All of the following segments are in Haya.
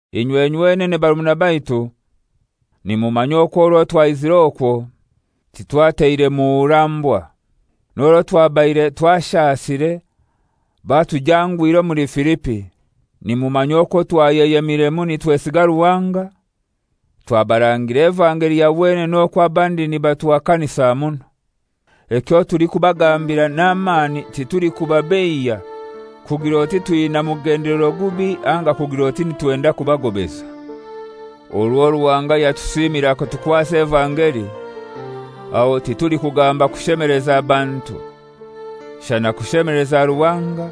Inywe nywenene barumuna baitu, nimumanya okwo orwo twaizire okwo titwateire muhurambwa. N'orwo twabaire twashasire, batujangwire omuli Filipi, nimumanya okwo twayeyemiremu nitwesiga Ruhanga twabarangira evangeli ya wenene oku abandi nibatuhakanisa muno. Ekyo tulikubagambira n'amani titulikubabeiya kugir'oti twina mugendelero gubi anga kugir'oti nitwenda kubagobeza. Orwo Ruhanga yatusimire akatukwasa evangeli, aho titulikugamba kushemeleza bantu, shana kushemeleza Ruhanga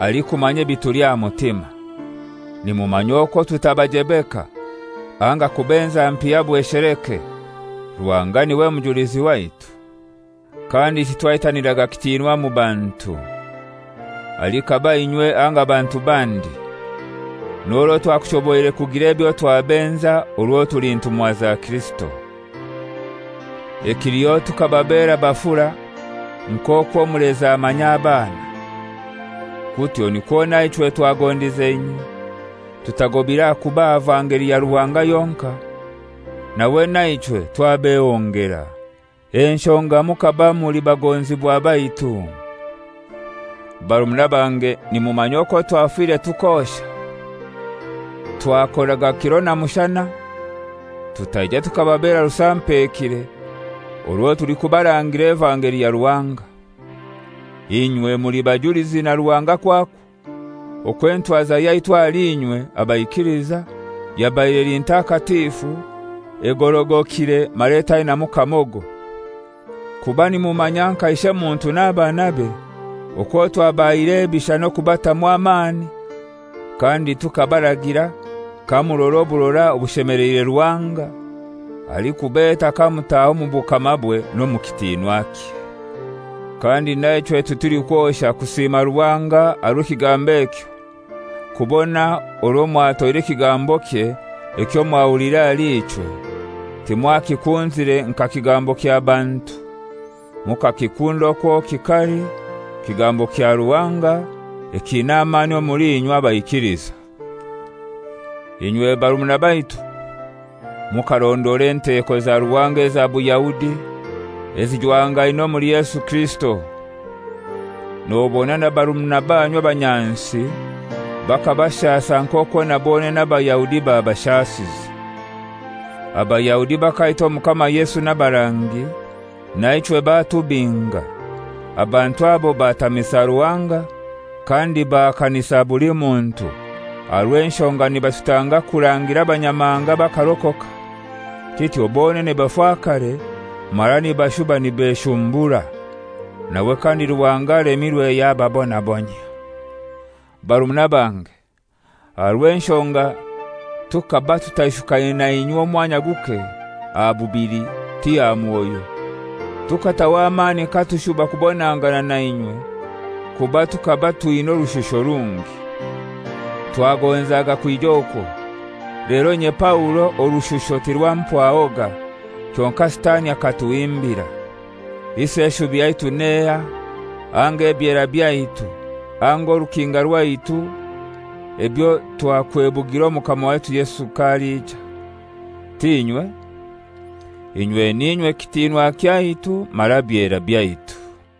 alikumanya ebituli aha mutima. Nimumanya okwo tutabajebeka, anga kubenza mpiya bwesheleke: Ruhanga niwe mujulizi waitu. Kandi titwaitaniraga kitinwa mu bantu, alikaba inywe anga bantu bandi, n'orwo twakushoboire kugira ebyo twabenza orwo tuli ntumwa za Kirisito. Ekiliho tukababera bafura nk'okwo omulezi amanya abaana. Kutyo nikwo naichwe twagondize inywe, tutagobire aha kubaha vangeli ya Ruhanga yonkai, nawe naichwe twabehongera; enshonga mukaba muli bagonzibwa baitu. Barumuna bange nimumanya okwo twafire tukosha. Twakoraga kiro na mushana tutaija tukababera rusampekire orwo tulikubarangira evangeli ya Ruhanga. Inywe muli bajulizi na Ruhanga kwakwo, okwo entwaza yaitu ahali inywe abaikiliza, yabaire eli ntakatifu, egorogokire mara etainamu kamogo. Kuba nimumanya, nka ishemuntu n'abanabe, okwo twabahaire ebisha n'okubatamu amani kandi tukabaragira kamurora oburora obushemeleire Ruhanga, alikubeta kamutaha omu bukamabwe n'omu kitinwakye. Kandi naichwe titulikwosha kusima Ruhanga aha rw'ekigambo ekyo, kubona orwo mwatoire ekigambokye ekyo mwahuliire ahali ichwe, timwakikunzire nka kigambo kya bantu, mukakikunda okwo kikali, kigambo kya Ruhanga ekiina amani omuli inywe, abaikiliza. Inywe barumuna baitu, mukarondora enteko za Ruhanga eza Buyahudi ezijwangaine omuli Yesu Kirisito. Nobona na barumuna banyu abanyansi bakabashasa nk'okwo na bonene Abayahudi babashasize. Abayahudi bakaita Omukama Yesu n'abarangi, naichwe batubinga. Abantu abo batamisa Ruhanga, kandi bahakanisa buli muntu, aha rw'enshonga nibatutanga kurangira Abanyamahanga bakarokoka; kityo bonene bafakare mara nibashuba nibeshumbura. Nawe kandi Ruhanga alemirwe yababonabonyia. Barumuna bange, aha rw'enshonga tukaba tutaishukaine nainywe omwanya guke, aha bubili, ti aha mwoyo, tukataho amani katushuba kubonangana nainywe, kuba tukaba twina orushusho rungi. Twagonzaga kwija okwo, lero inye Paulo orushusho tirwampwahoga, kyonkai Sitani akatuhimbira. Isi eshubi yaitu n'ehai, anga ebyera byaitu, anga orukinga rwaitu ebyo twakwebugira Omukama waitu Yesu k'aliija? T'inywe? Inywe n'inywe kitinwa kyaitu mara byera byaitu.